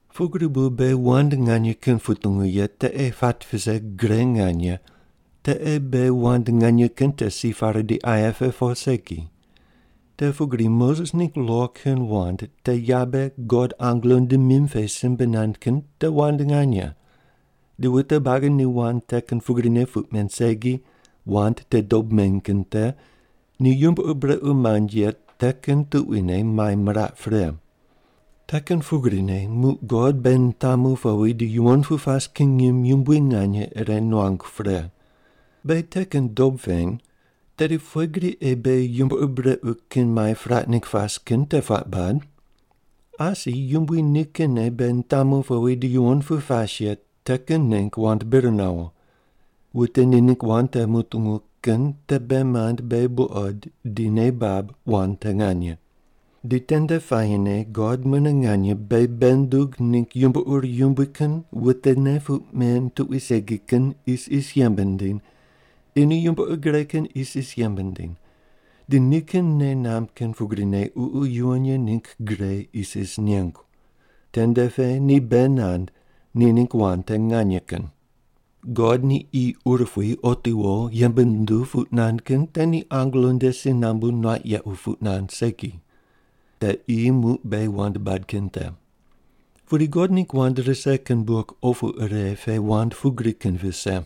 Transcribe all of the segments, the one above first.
Pugri bu beghi wand nganye kin putungu ye te ei pat vise gre nganye te ei beghi wand nganye kin te si pare di aye pe po segi. Te pugri Moses ningg lo kin wand te yabe God angelo nde mim pe simbe nand kin te wand nganye, di wute buagi ni wand te kin pugrine puq men segi, wand te dob meny kin te, ni yumbo ur brequ mand ye te kin tuquine mai miraq pre. Te kin pugrine muq God beghi nitamu powi di yuwon pu pas kin ngim yumbui nganye ire nuangu pre. Beghi te kin dob peny, tedi pughe gri ei beghi yumbo ur brequ kin mai piraq ningg pas kin te puaq bad? Asi Yumbui nikinne beghi nitamu powi di yuwon pu pas ye te kin ningg wand bir nawo. Wute ni ningg wand te mutungu kin te bei mand beghi buqod di nei bab wand te nganye. Di tende puayine God mune nganye beghi bei nundug ningg yumbo ur yumbui kin wutene puq men tuqui segi kin isis yembe nindiny di ni yumbo ur gre kin isis yembe nindiny, di nikin nei namb kin pugrine Ququ Yuwon Ye ningg gre isis nengu. Tende pe ni bei nand ni ningg wand te nganye kin. God ni qi urupui otiwo yembe nunduw puq nand kin te ni angelo nde si nambu nuaq yequ puq nand segi. Te qi muq beghi wand bad kin te. Pudi God ningg wand rise kin buk opu ire pe wand pugri kin vise: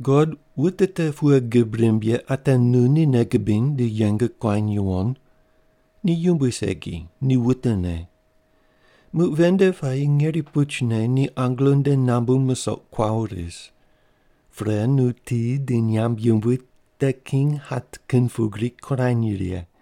God, wute te pughe gib rimb ye ate nu ni nei gubiny di yeng kuany yuwon? Ni yumbui segi, ni wutene. Muq ven nde puayi ngeri puchne ni angelo nde nambu musoq kuawo ris. Pre nu ti di nyamb yumbui te king hat kin pugri kurany righe.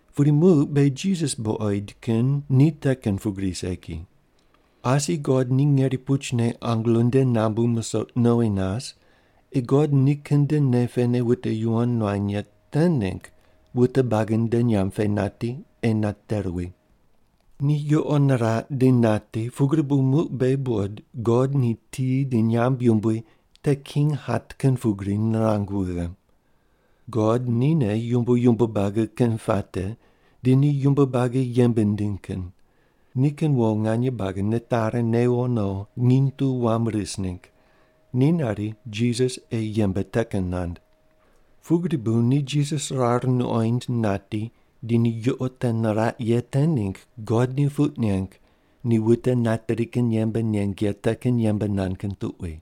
Pudi muq beghi Jisas buqoid kin ni te kin pugri segi. Asi God ni ngeri puchne angelo nde nambu musoq nowi nas ei God nikin nde nei pene wute yuwon nuany ye te ningg wute buagi nde nyamb pe nati ei nate ruwi. Ni yuqo niraq di nati pugri bu muq beghi buqod God ni ti di nyamb yumbui te king hat kin pugri nirang wughe. God nine yumbo yumbo buagi kin puate di ni yumbo buagi yembe nindiny kin, nikin wo nganye buagi nitari newo no nginy tu wam ris ningg, ni nari Jisas ei yembe te kin nand. Pugri bu ni Jisas rar nuqoind nati, di ni yuqo te niraq ye te ningg God ni puq neng ni wute nateri kin yembe neng ye te kin yembe nand kin tuqui.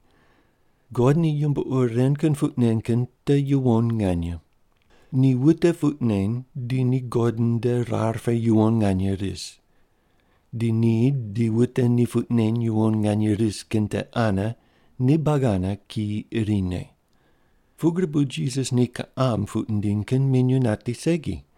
God ni yumbo ur ren kin puq nen kin te yuwon nganye. Ni wute puq neny di ni God nde rar pe yuwon nganye ris. Di ni di wute ni puq neny yuwon nganye ris kin te ane ni buagi ane kiyi irine. Pugri bu Jisas ni kiqam puq nindiny kin minyuw nati segi.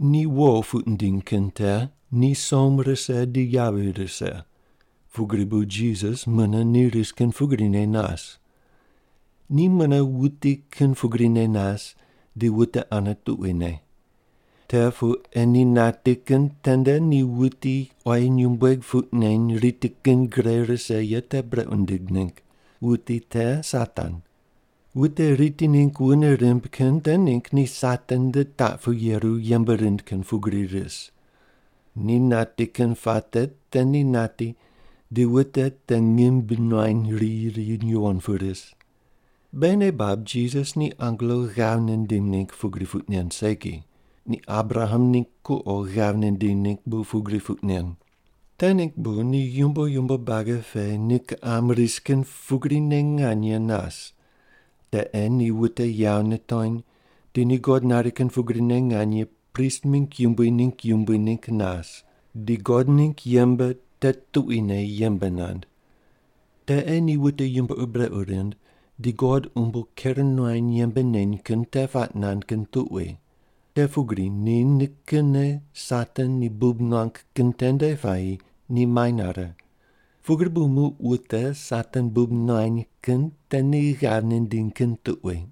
Ni wo puq nindiny kin te ni som rise di yavi rise, pugri bu Jisas mune ni ris kin pugrine nas. Ni mune wuti kin pugrine nas di wute ane tuquine. Te pu ei ni nati kin tende ni wuti quayi nyumbueg puq neny riti kin gre rise ye te brequ nindig ningg. Wuti te Satan. Wute riti ningg wune rimb kin te ningg ni Satan nde taq pu yeru yembe rind kin pugri ris. Ni nati kin puate te ni nati di wute te ngim bi nuany riyi ri yuwon pu ris. Beghi nei bab Jisas ni angelo ghav nindim ningg pugri puq nen segi, ni Abraham ningg kuqo ghav nindiny ningg bu pugri puq nen. Te ningg bu ni yumbo yumbo buagi pe ni kiqam ris kin pugrine nganye nas, te ei ni wute yawo nitony di ni God nari kin pugrine nganye prist mingg yumbui ni yumbui ningg nas di God ningg yembe te tuquine yembe nand. Te ei ni wute yumbo ur brequ rind di God umbo ker nuany yembe neny kin te puaq nand kin tuqui. Te pugri ni nikinne Satan ni bub nuang kin tende puayi ni mai nare, pugri bu muq wute Satan bub nuany kin te ni ghav nindiny kin tuqui.